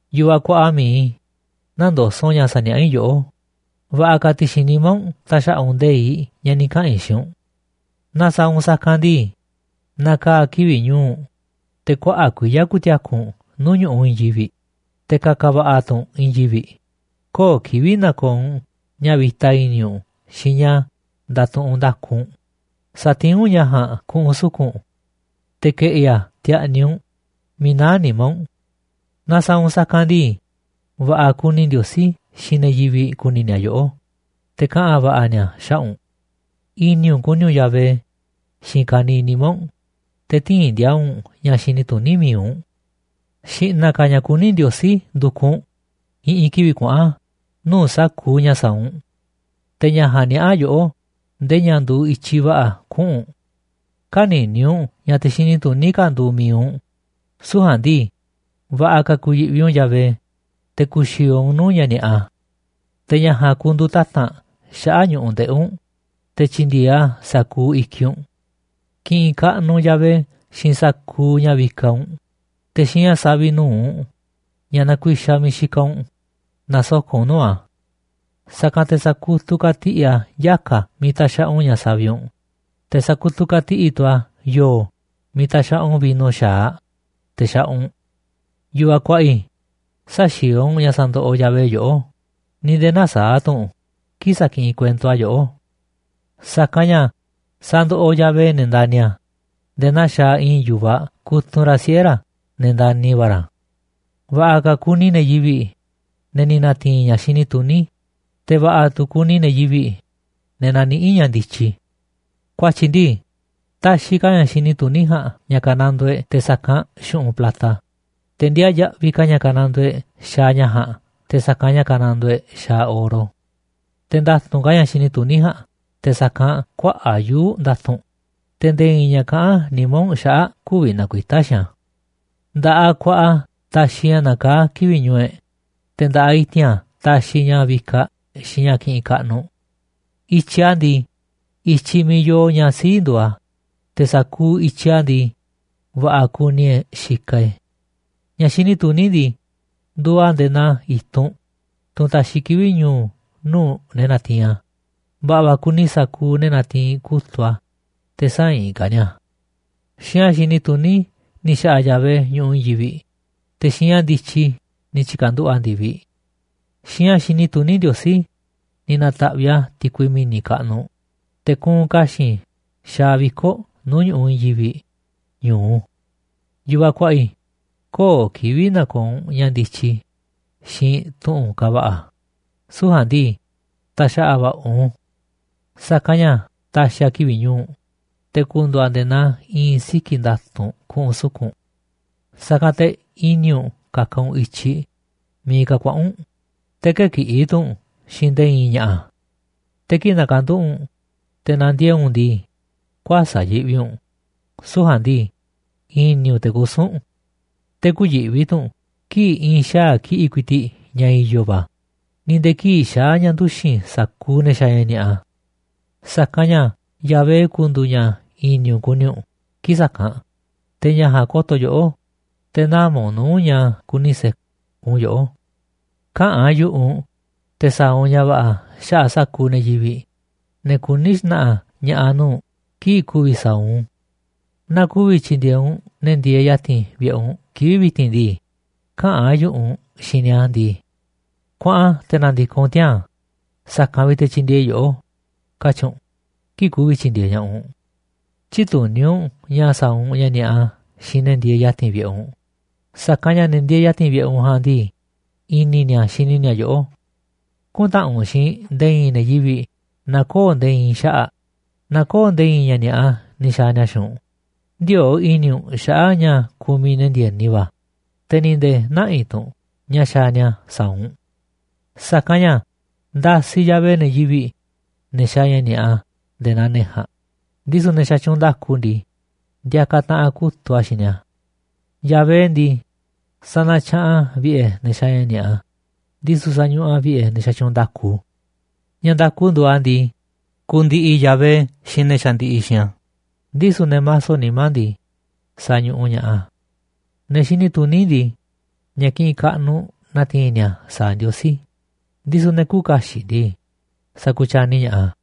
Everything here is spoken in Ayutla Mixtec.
Yu̱vaꞌ kuaꞌa mi̱iꞌ i̱, nä̱ndoso̱ꞌ u̱nꞌ ña̱ ni̱ sa̱niaꞌá i̱ yoꞌó, va̱ꞌa̱ ka̱ ti̱xi̱n nimá u̱nꞌ ta̱xa̱ꞌa̱ u̱nꞌ nde̱iꞌ ña̱ ni̱ kaꞌa̱n i̱ xiinꞌ u̱nꞌ. Naaꞌ sa̱a̱ u̱nꞌ sa̱kanꞌ ndii, na̱kaa̱ kivi̱ꞌ ñu̱u̱ u̱nꞌ, te̱ kuaꞌa̱ꞌ kuiya̱ ku̱ti̱a̱ku̱ u̱nꞌ nuu̱ꞌ ñu̱ꞌuꞌ i̱i̱n yivi̱ꞌ, te̱ ka̱ka̱ va̱ꞌa̱ tu̱ u̱nꞌ i̱i̱n yivi̱ꞌ. Köo̱ꞌ kivi̱ꞌ na̱ko̱o̱ u̱nꞌ ña̱ vi̱ta i̱ni̱ u̱nꞌ xiinꞌ ña̱ nda̱tuꞌunꞌ nda̱ku u̱nꞌ, satiín u̱nꞌ ña̱ ja̱a̱nꞌ ku̱ꞌu̱n suku̱nꞌ u̱nꞌ, te̱ ke̱ꞌi̱ a̱ ti̱a̱ꞌni̱ u̱nꞌ miiꞌ naá nimá u̱nꞌ. Naaꞌ sa̱a̱ u̱nꞌ sa̱kanꞌ ndii, va̱ꞌa̱ kuni Ndiosí xiinꞌ ne̱ yivi̱ꞌ ku̱ni̱ ni̱a̱ yoꞌó, te̱ kaꞌa̱n va̱ꞌa̱ nia̱ xaꞌa̱ꞌ u̱nꞌ. I̱ni̱ u̱nꞌ ku̱ni̱ u̱nꞌ Yahvé xiinꞌ ka̱niiꞌ nimá u̱nꞌ, te̱ tï̱i̱n ndi̱a̱a̱ u̱nꞌ ña̱ xini tuní mi̱iꞌ u̱nꞌ. Xi̱ꞌna̱ ka̱ ña̱ kuní Ndiosí ndu̱kuꞌ u̱nꞌ i̱ꞌi̱n kivi̱ꞌ kuaꞌa̱n nuu̱ꞌ sa̱kuuꞌ ña̱ sa̱a̱ u̱nꞌ, te̱ ña̱ ja̱a̱nꞌ niaꞌa̱ yoꞌó ndee ña̱ nduuꞌ i̱tyiꞌ va̱ꞌa̱ kuꞌu̱n u̱nꞌ. Kä̱ni̱ni̱ u̱nꞌ ña̱ te̱ xini tuní ka̱ nduuꞌ mi̱iꞌ u̱nꞌ, süu̱ꞌ ja̱a̱nꞌ ndii, va̱ꞌa̱ ka̱ ku̱yi̱ꞌvi u̱nꞌ Yahvé, te̱ ku̱xi̱o̱o̱ u̱nꞌ nuu̱ꞌ ña̱ ni̱a̱ꞌa. Te̱ ña̱ ja̱a̱nꞌ ku̱ndu̱u̱ tata̱nꞌ xaꞌa̱ꞌ ñu̱ꞌuꞌ ndeꞌi̱ u̱nꞌ, te̱ tyi̱ndi̱e̱eꞌ a̱ sa̱kuuꞌ i̱kiꞌ u̱nꞌ. Ki̱ꞌi̱n kaꞌnuꞌ u̱nꞌ Yahvé xiinꞌ sa̱kuuꞌ ña̱ vikaꞌ u̱nꞌ, te̱ xiinꞌ ña̱ saviꞌ nu̱uꞌ ña̱ nakuixaꞌ miiꞌ xikaꞌ u̱nꞌ na̱soko̱ꞌ u̱nꞌ nuu̱ꞌ a̱. Sa̱kanꞌ te̱ sa̱kutuꞌ ka̱tiꞌi̱ꞌ a̱ yaka̱ miiꞌ taxaꞌa u̱nꞌ ña̱ saviꞌ u̱nꞌ, te̱ sa̱kutuꞌ ka̱tiꞌi̱ꞌ tu̱ a̱ yo̱o̱ miiꞌ taxaꞌa u̱nꞌ vino xa̱aꞌ, teꞌ xaꞌa u̱nꞌ. Yu̱vaꞌ kuaꞌa i̱, sä̱xi̱o̱o̱ u̱nꞌ ña̱ sandoꞌoꞌ Yahvé yoꞌó, ni̱ nde̱e̱ nä̱saa̱ꞌ tu̱ u̱nꞌ kii̱ꞌ sakiꞌinꞌ kuento a̱ yoꞌó. Sa̱kanꞌ ña̱ sandoꞌoꞌ Yahvé ne̱ ndani̱ a̱, nde̱e̱ naa xaaꞌ i̱i̱n yu̱vaꞌ kutunꞌ ra̱ siꞌe̱ ra̱ ne̱ ndani̱ va̱ ra̱. Va̱ꞌa̱ va̱ kuni ne̱ yivi̱ꞌ, ne̱ ni̱ na̱ti̱i̱n ña̱ xini tuní, te̱ va̱ꞌa̱ tu̱ kuni ne̱ yivi̱ꞌ, ne̱ naniꞌí ña̱ ndityi. Ku̱a̱tyi̱ ndii, taxiꞌ ka̱ ña̱ xini tuní ja̱a̱nꞌ ña̱ ka̱nandoo e̱ꞌ te̱ sa̱kanꞌ xu̱ꞌunꞌ plata, te̱ ndiaa yaꞌviꞌ ka̱ ña̱ kanandoo e̱ꞌ xaaꞌ ña̱ ja̱a̱nꞌ te̱ sa̱kanꞌ ña̱ kanandoo e̱ꞌ xaaꞌ oro. Te̱ nda̱tu̱nꞌ ka̱ ña̱ xini tuní ja̱a̱nꞌ te̱ sa̱kanꞌ kuaꞌa̱ꞌ yuu̱ꞌ nda̱tu̱nꞌ, te̱ nde̱e̱ i̱i̱n ña̱ kaꞌán nimá u̱nꞌ xaꞌa̱ꞌ kü̱vi̱ na̱kuita̱ xiinꞌ a̱. Nda̱ꞌaꞌ ku̱a̱ꞌa̱ a̱ taxiꞌ ña̱ nakaá kivi̱ꞌ ñu̱u̱ e̱ꞌ, te̱ nda̱ꞌaꞌ i̱ti̱n a̱ taxiꞌ ña̱ vikaꞌ xiinꞌ ña̱ kiꞌinꞌ kaꞌnuꞌ. I̱tyiꞌ a̱ ndii, i̱tyiꞌ miiꞌ yoo ña̱ sii̱ꞌ nduuꞌ a̱, te̱ sa̱kuuꞌ i̱tyiꞌ a̱ ndii, va̱ꞌa̱ kuni e̱ꞌ xikaꞌ e̱ꞌ e̱. Ña̱ xini tuní ndii, nduuꞌ a̱ nde̱e̱ naa i̱tunꞌ, tunꞌ taxiꞌ kivi̱ꞌ ñu̱u̱ nuu̱ꞌ ne̱ natiinꞌ a̱, va̱ꞌa̱ va̱ kuni sa̱kuuꞌ ne̱ natiinꞌ kutu̱ꞌ a̱ te̱ sä̱inꞌ ka̱ ni̱a̱ a̱. Xiinꞌ ña̱ xini tuní ni̱ xa̱ꞌa̱ Yahvé ñu̱ꞌuꞌ i̱i̱n yivi̱ꞌ, te̱ xiinꞌ ña̱ ndityi ni̱ tyi̱ka̱nduꞌu̱ꞌ a̱ ndi̱viꞌ. Xiinꞌ ña̱ xini tuní Ndiosí ni̱ na̱ta̱ꞌviꞌ a̱ ti̱kui mi̱ni̱ kaꞌnuꞌ, te̱ kuunꞌ ka̱xi̱n xaaꞌ viko̱ꞌ nuu̱ꞌ ñu̱ꞌuꞌ i̱i̱n yivi̱ꞌ ñu̱u. Yu̱vaꞌ kuaꞌa i̱, köo̱ꞌ kivi̱ꞌ na̱ko̱o̱ u̱nꞌ ña̱ ndityi xiinꞌ tu̱ꞌu̱n kava̱ꞌa̱, süu̱ꞌ ja̱a̱nꞌ ndii, ta̱xa̱ꞌa̱ va̱ꞌa̱ u̱nꞌ u̱n. Sa̱kanꞌ ña̱ ta̱xi̱ a̱ kivi̱ꞌ ñu̱u̱ u̱nꞌ, te̱ ku̱ndu̱u̱ a̱ nde̱e̱ naa i̱i̱n siki̱ nda̱tu̱nꞌ ku̱ꞌu̱n suku̱nꞌ u̱nꞌ. Sa̱kanꞌ te̱ i̱ni̱ u̱nꞌ ka̱ka̱ u̱nꞌ i̱tyiꞌ miiꞌ ka̱ kuaꞌa̱n u̱nꞌ, te̱ kë̱kiꞌi̱ tu̱ u̱nꞌ xiinꞌ nde̱e̱ i̱i̱n ña̱ꞌa̱. Te̱ kii̱ꞌ na̱ka̱nduꞌu̱ꞌ u̱nꞌ te̱ na̱ndiee̱ꞌ u̱nꞌ ndii, kuäsa̱ꞌ yiꞌvi u̱nꞌ, süu̱ꞌ ja̱a̱nꞌ ndii, i̱ni̱ u̱nꞌ te̱ kusu̱n u̱nꞌ. Te̱ kü̱yi̱ꞌvi tu̱ u̱nꞌ kii̱ꞌ i̱i̱n xaa̱ kiꞌi̱ꞌ ku̱i̱ti̱ꞌ ña̱ i̱yo̱ va̱, ni̱ nde̱e̱ kii̱ꞌ xaa̱ ña̱ nduxi̱n sa̱kuuꞌ ne̱ xaaꞌ ña̱ ni̱a̱ꞌa. Sa̱kanꞌ ña̱ Yahvé ku̱ndu̱u̱ ña̱ i̱ni̱ u̱nꞌ ku̱ni̱ u̱nꞌ kii̱ꞌ sa̱kanꞌ, te̱ ña̱ ja̱a̱nꞌ ko̱to̱ yoꞌó, te̱ nä̱ma̱ u̱nꞌ nuu̱ꞌ ña̱ kuni se̱kun yoꞌó. Käꞌa̱n yu̱ꞌuꞌ u̱nꞌ te̱ sa̱a̱ u̱nꞌ ña̱ va̱ꞌa̱ xaꞌa̱ꞌ sa̱kuuꞌ ne̱ yivi̱ꞌ, ne̱ kuní xna̱ꞌa̱ ña̱ꞌa̱ nuu̱ꞌ kii̱ꞌ ku̱vi̱ sa̱a̱ u̱nꞌ u̱n. Naaꞌ ku̱vi̱ tyi̱ndi̱e̱eꞌ u̱nꞌ ne̱ ndieeꞌ ya̱ti̱n vi̱ꞌe̱ u̱nꞌ kivi̱ꞌ vi̱ti̱n ndii, käꞌa̱n u̱nꞌ xiinꞌ ni̱a̱ ndii: “Kuaꞌan, te̱ na̱ndi̱koꞌ u̱nꞌ tiaa̱n, sa̱kanꞌ vi̱ꞌ te̱ tyi̱ndi̱e̱eꞌ i̱ yoꞌó”, katyi̱ u̱nꞌ kii̱ꞌ ku̱vi̱ tyi̱ndi̱e̱eꞌ ña̱ꞌaꞌ u̱nꞌ. Tyï̱tuní u̱nꞌ ña̱ sa̱a̱ u̱nꞌ ña̱ ni̱a̱ꞌa xiinꞌ ne̱ ndieeꞌ ya̱ti̱n vi̱ꞌe̱ u̱nꞌ, sa̱kanꞌ ña̱ ne̱ ndieeꞌ ya̱ti̱n vi̱ꞌe̱ u̱nꞌ ja̱a̱nꞌ ndii, i̱ni̱ ni̱a̱ xini ni̱a̱ yoꞌó. Kü̱ntaꞌanꞌ u̱nꞌ xiinꞌ nde̱e̱ i̱i̱n ne̱ yivi̱ꞌ naaꞌ köo̱ꞌ nde̱e̱ i̱i̱n xaꞌa̱ꞌ, naaꞌ köo̱ꞌ nde̱e̱ i̱i̱n ña̱ ni̱a̱ꞌa ni̱ xa̱a̱ ni̱a̱ xiinꞌ u̱nꞌ. Ndiöo̱ꞌ i̱ni̱ u̱nꞌ xaꞌa̱ꞌ ña̱ kumiꞌ ne̱ ndi̱e̱ni va̱, te̱ ni̱ nde̱e̱ nä̱ꞌi̱ tu̱ u̱nꞌ ña̱ xaaꞌ ni̱a̱ sa̱a̱ u̱nꞌ. Sa̱kanꞌ ña̱ ndasiꞌ Yahvé ne̱ yivi̱ꞌ, ne̱ xaaꞌ ña̱ ni̱a̱ꞌa nde̱e̱ naa ne̱ ja̱a̱nꞌ, ndisu̱ ne̱ xatyuunꞌ nda̱ku ndii, ndiakaꞌ taꞌanꞌ kutu̱ꞌ a̱ xiinꞌ ni̱a̱. Yahvé ndii, sanatyaꞌanꞌ a̱ vi̱ꞌe̱ ne̱ xaaꞌ ña̱ ni̱a̱ꞌa, ndisu̱ sañuꞌuꞌ a̱ vi̱ꞌe̱ ne̱ xatyuunꞌ nda̱ku. Ña̱ nda̱ku nduuꞌ a̱ ndii, ku̱ndi̱ꞌi̱ Yahvé xiinꞌ ne̱ xandiꞌiꞌ xiinꞌ a̱, ndisu̱ ne̱ maso nimá ndii, sa̱ñuꞌuꞌ ña̱ꞌaꞌ a̱. Ne̱ xini tuní ndii, ña̱ kiꞌinꞌ kaꞌnuꞌ na̱ti̱i̱n ni̱a̱ sa̱a̱ Ndiosí, ndisu̱ ne̱ küuꞌ kaxiꞌ ndii, sa̱ku̱tyani ña̱ꞌaꞌ a̱.